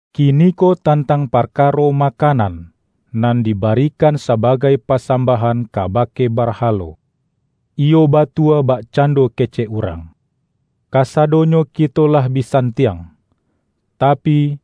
Kiniko tantang parkaro makanan, nan dibarikan sabagai pasambah-an kabake barhalo. Iyo batua bakcan-do kecek urang,”Kasadonyo kito lah bi santiang.” Tapi,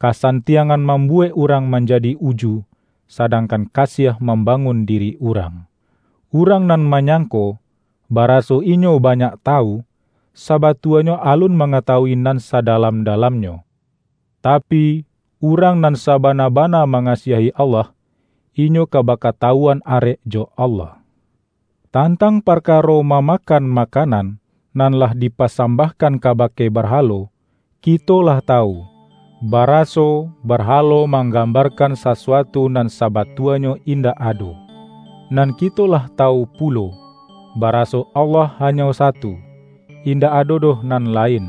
kasantiangan mam-buwek urang manjadi uju, sadangkan kasiah mambangun diri urang. Urang nan manyangko, baraso inyo banyak tawu, sabatuanyo alun mangatawui nan sadalam-dalamnyo. Tapi, urang nan sabana-bana mangasiahi Allah, inyo ka bakatawuan arek jo Allah. Tantang parkaro mamakan ma-kanan, nan lah dipasambahkan ka-bake barhalo, kito lah tawu, baraso barhalo manggambarkan sasuatu nan sabatuanyo indak ado. Nan kito lah tawu pulo, baraso Allah hanyo satu; indak ado doh nan lain.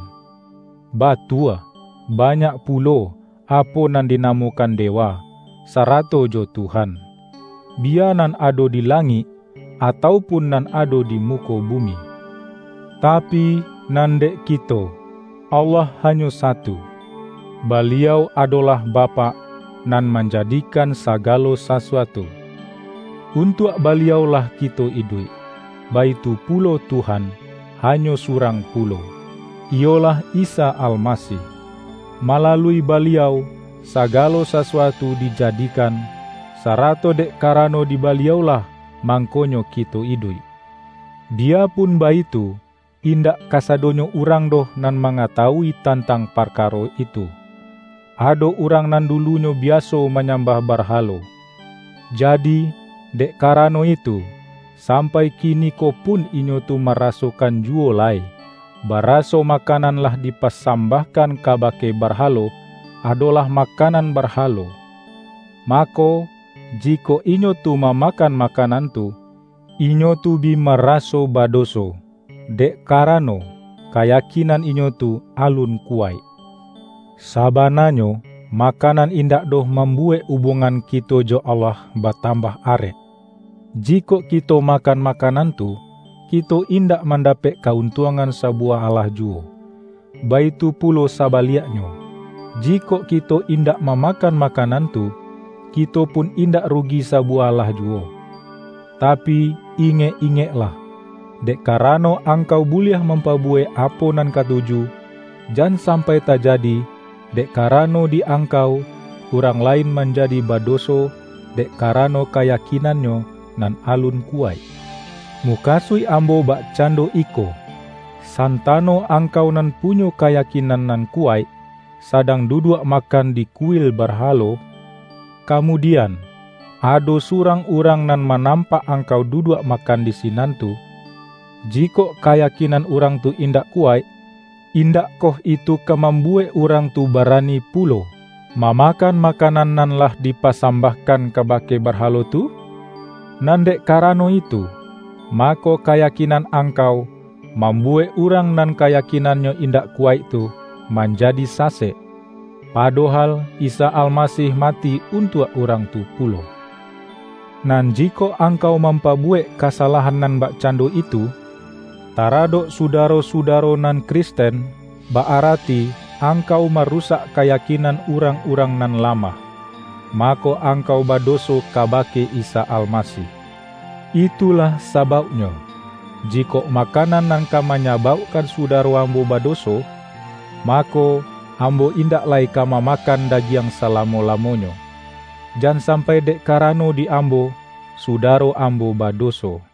Batua, ba-nyak pulo, apo nan dinamokan de-wa, sarato jo tuhan; biya nan ado di langik, atau pun nan ado di muko bu-mi. Tapi, nan dek kito, Allah hanyo satu. Baliau adolah Bapak, nan manja-dikan sagalo sasuatu. Untuak Baliau-lah kito iduik. Baitu pulo Tuhan, ha-nyo surang pulo, iyolah Isa Almasih. Malalui Baliau sagalo sasuatu dijadi-kan, sarato dek karano di Baliau-lah mangkonyo kito iduik. Biyapun baitu, indak kasadonyo urang doh nan mangatawui tantang parkaro itu. Ado urang nan dulunyo biaso manyambah barhalo. Jadi, dek karano itu, sampai kiniko pun inyo tu marasokan juwo lai, baraso makanan nan lah dipasambahkan kabake bar-halo, adolah makanan barhalo. Mako, jikok inyo tu mamakan makanan tu, inyo tu bi maraso badoso; dek karano, kayakinan inyo tu alun kuwaik. Sa-bananyo, makanan indak doh mam-buwek ubuangan kito jo Allah batam-bah arek. Jikok kito makan makanan tu, kito indak mandapek ka-untuangan sabuwah alah juwo. Baitu pulo sa-baliaknyo, jikok kito indak mamakan makanan tu, kito pun indak rugi sa-buwah alah juwo. Tapi, ingek-ingeklah! Dek karano angkau buliah mampabuwek apo nan katuju. Jan sampai tajadi, dek kara-no di angkau, urang lain manjadi ba-doso - dek karano kayakinannyo nan alun kuwaik. Mukasuik ambo bak-cando iko: Santano angkau nan punyo kayakinan nan kuwaik, sadang duduak makan di kuil barhalo. Kamudian, ado surang urang nan manampak angkau duduak makan di sinan tu. Jikok kaya-kinan urang tu indak kuwaik, indak-koh itu ka mambuwek urang tu bara-ni pulo, mamakan makanan nan lah dipasambahkan kabake barhalo tu? Nan dek karano itu, mako kayakin-an angkau, mambuwek urang nan ka-yakinannyo indak kuwaik tu, manjadi sasek. Padohal Isa Almasih mati un-tuak urang tu pulo. Nan jikok angkau mampabuwek kasalahan nan bakcando itu, taradok sudaro-sudaro nan Kristen - ba-arati angkau marusak kayakinan urang-urang nan lamah - mako angkau badoso kabake Isa Almasih. Itulah sa-bauknyo, jikok makanan nan ka manya-baukkan sudaro ambo badoso, mako, ambo indak lai ka mamakan dagiang salamo-lamonyo. Jan sampai dek kara-no di ambo, sudaro ambo badoso.